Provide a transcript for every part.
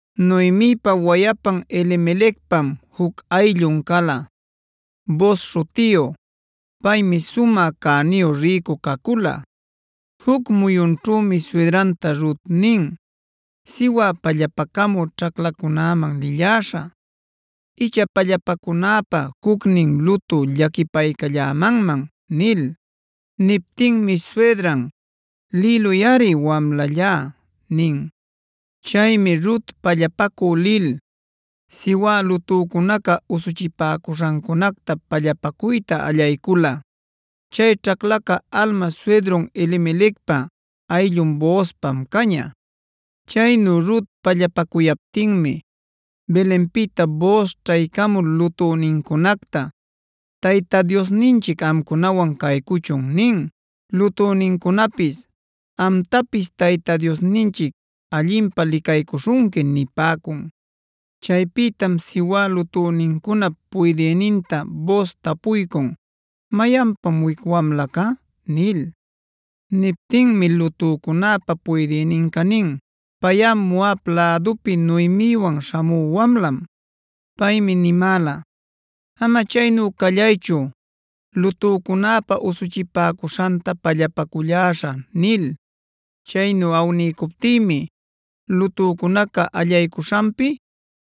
Noemipa wayapan Elimelecpam juc ayllun cala, Booz śhutiyu. Paymi sumä cäniyu rïcu cacula. Juc muyunćhümi suydranta Rut nin: “Siwä pallapacamüa ćhaclacunaman lilläśhä, icha pallapacunäpä jucnin lutü llaquipaycallämanman” nil. Niptinmi suydran: “Lïluyꞌari, wamlallá” nin. Chaymi Rut pallapacü lil, siwä lutücunaca usuchipäcuśhancunacta pallapacuyta allaycula. Chay ćhaclaca alma suydrun Elimelecpa ayllun Boozpam caña. Chaynu Rut pallapacuyaptinmi Belenpïta Booz ćhaycamul lutünincunacta: “Tayta Diosninchic amcunawan caycuchun” nin. Lutünincunapis: “Amtapis Tayta Diosninchic allinpä licaycuśhunqui” nipäcun. Chaypïtam siwä lutünincunap puydïninta Booz tapuycun: “¿Mayanpam wic wamlaca?” nil. Niptinmi lutücunäpä puydïninca nin: “Payꞌa Moab lädupi Noemiwan śhamü wamlam. Paymi nimäla: ‘Ama chaynu callaychu lutücunäpä usuchipäcuśhanta pallapaculläśhä’ nil. Chaynu awniycuptïmi lutücunaca allaycuśhanpi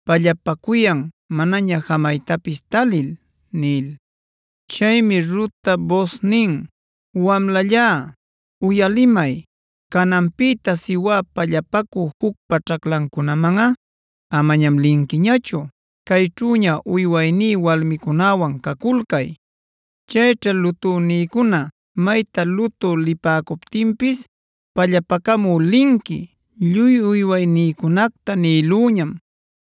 pallapacuyan manaña jamaytapis talil” nil. Chaymi Rutta Booz nin: “Wamlallá, uyalimay. Cananpïta siwä pallapacü jucpa ćhaclancunamanꞌa amañam linquiñachu. Cayćhüña uywayní walmicunäwan caculcay. Chayćha lutünïcuna mayta lutü lipäcuptinpis pallapacamü linqui. Lluy uywaynïcunacta nïlüñam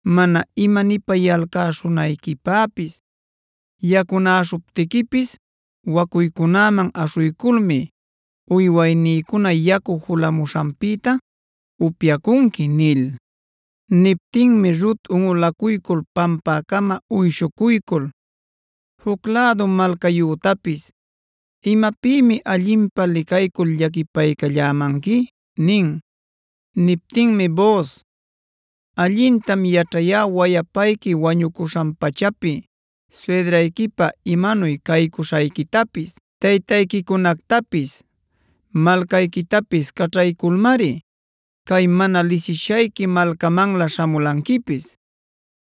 mana imanipayalcä-śhunayquipäpis. Yacunäśhuptiquipis wacuycunaman aśhuyculmi uywaynïcuna yacu julapämuśhanpïta upyacunqui” nil. Niptinmi Rut unꞌulacuycul pampäcama uyshucuycul: “Juc lädu malcayütapis ¿imapïmi allinpä licaycul llaquipaycallämanqui?” nin. Niptinmi Booz: “Allintam yaćhayá wayapayqui wañucuśhan-pachapi suydrayquipä imanuy caycuśhayquitapis; taytayquicunactapis, malcayquitapis caćhayculmari cay mana lisishayqui malcamanlä śhamulanquipis.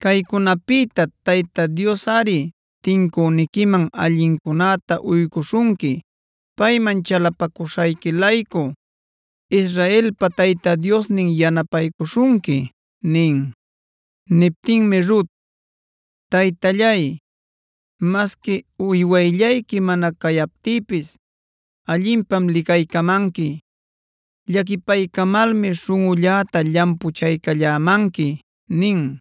Caycunapïta Tayta Diosꞌari tincüniquiman allincunäta uycuśhunqui. Payman chalapacuśhayqui-laycu Israelpa Tayta Diosnin yanapaycuśhunqui” nin. Niptinmi Rut: “Taytallay, masqui uywayllayqui mana cayaptïpis allinpam licaycamanqui; llaquipaycamalmi śhunꞌulläta llampuchaycallämanqui” nin.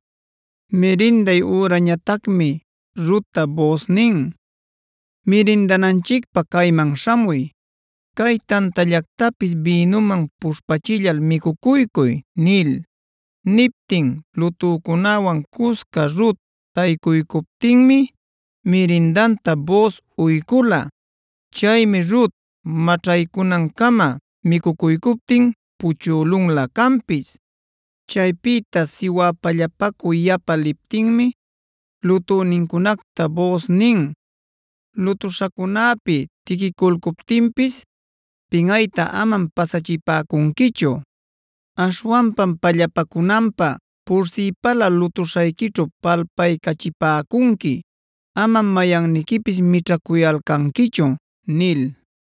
Mirinday ürañatacmi Rutta Booz nin: “Mirindananchicpä cayman śhamuy. Cay tantallactapis bïnumanb puśhpachillal micucuycuy” nil. Niptin lutücunäwan cusca Rut taycuycuptinmi, mirindanta Booz uycula. Chaymi Rut maćhaycunancama micucuycuptin puchülunlä canpis. Chaypïta siwä pallapacü yapa liptinmi, lutünincunacta Booz nin: “Lutuśhacunäpi tiquiculcuptinpis pinꞌayta amam pasachipäcunquichu. Aśhwanpam pallapacunanpä pursïpala lutuśhayquićhu palpaycachipäcunqui. Amam mayanniquipis mićhacuyalcanquichu” nil.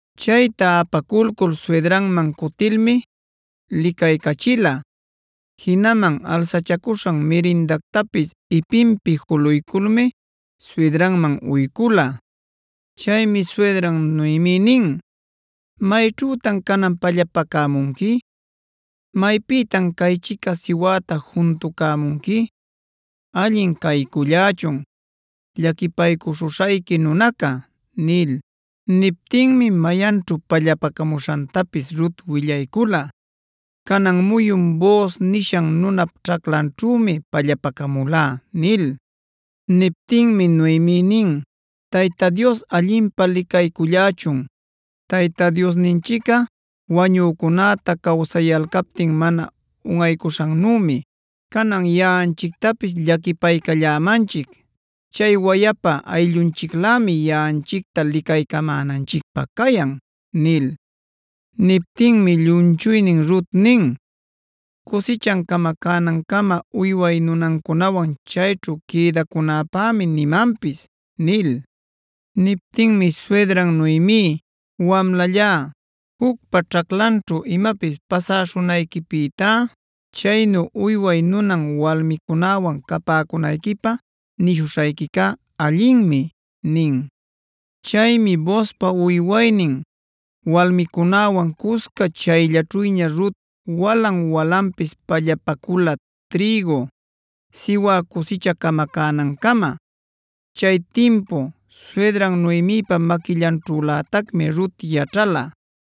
Chayta apaculcul suydranman cutilmi licaycachila. Jinaman alsachacuśhan mirindactapis ipinpi juluyculmi suydranman uycula. Chaymi suydran Noemi nin: “¿Mayćhütan canan pallapacämunqui? ¿Maypïtan caychica siwäta juntucämunqui? ¡Allin caycullächun llaquipaycuśhuśhayqui nunaca!” nil. Niptinmi mayanćhu pallapacamuśhantapis Rut willaycula: “Canan muyun Booz nishan nunap ćhaclanćhümi pallapacamulá” nil. Niptinmi Noemi nin: “¡Tayta Dios allinpä licaycullächun! Tayta Diosninchicꞌa wañücunäta cawsayalcaptin mana unꞌaycuśhannümi, canan yaꞌanchictapis llaquipaycallämanchic. Chay wayapa ayllunchiclämic yaꞌanchicta licaycamänanchicpä cayan” nil. Niptinmi llumchuynin Rut nin: “Cusichan camacanancama uyway nunancunawan chayćhu quïdacunäpämi nimanpis” nil. Niptinmi suydran Noemi: “Wamlallá, jucpa ćhaclanćhu imapis pasäśhunayquipïtá, chaynu uyway nunan walmicunäwan capäcunayquipä nishuśhayquicá allinmi” nin. Chaymi Boozpa uywaynin walmicunäwan cusca chayllaćhüña Rut walan-walanpis pallapacula trïgu, siwä cusicha camacänancama. Chay timpu, suydran Noemipa maquillanćhülätacmi Rut yaćhala.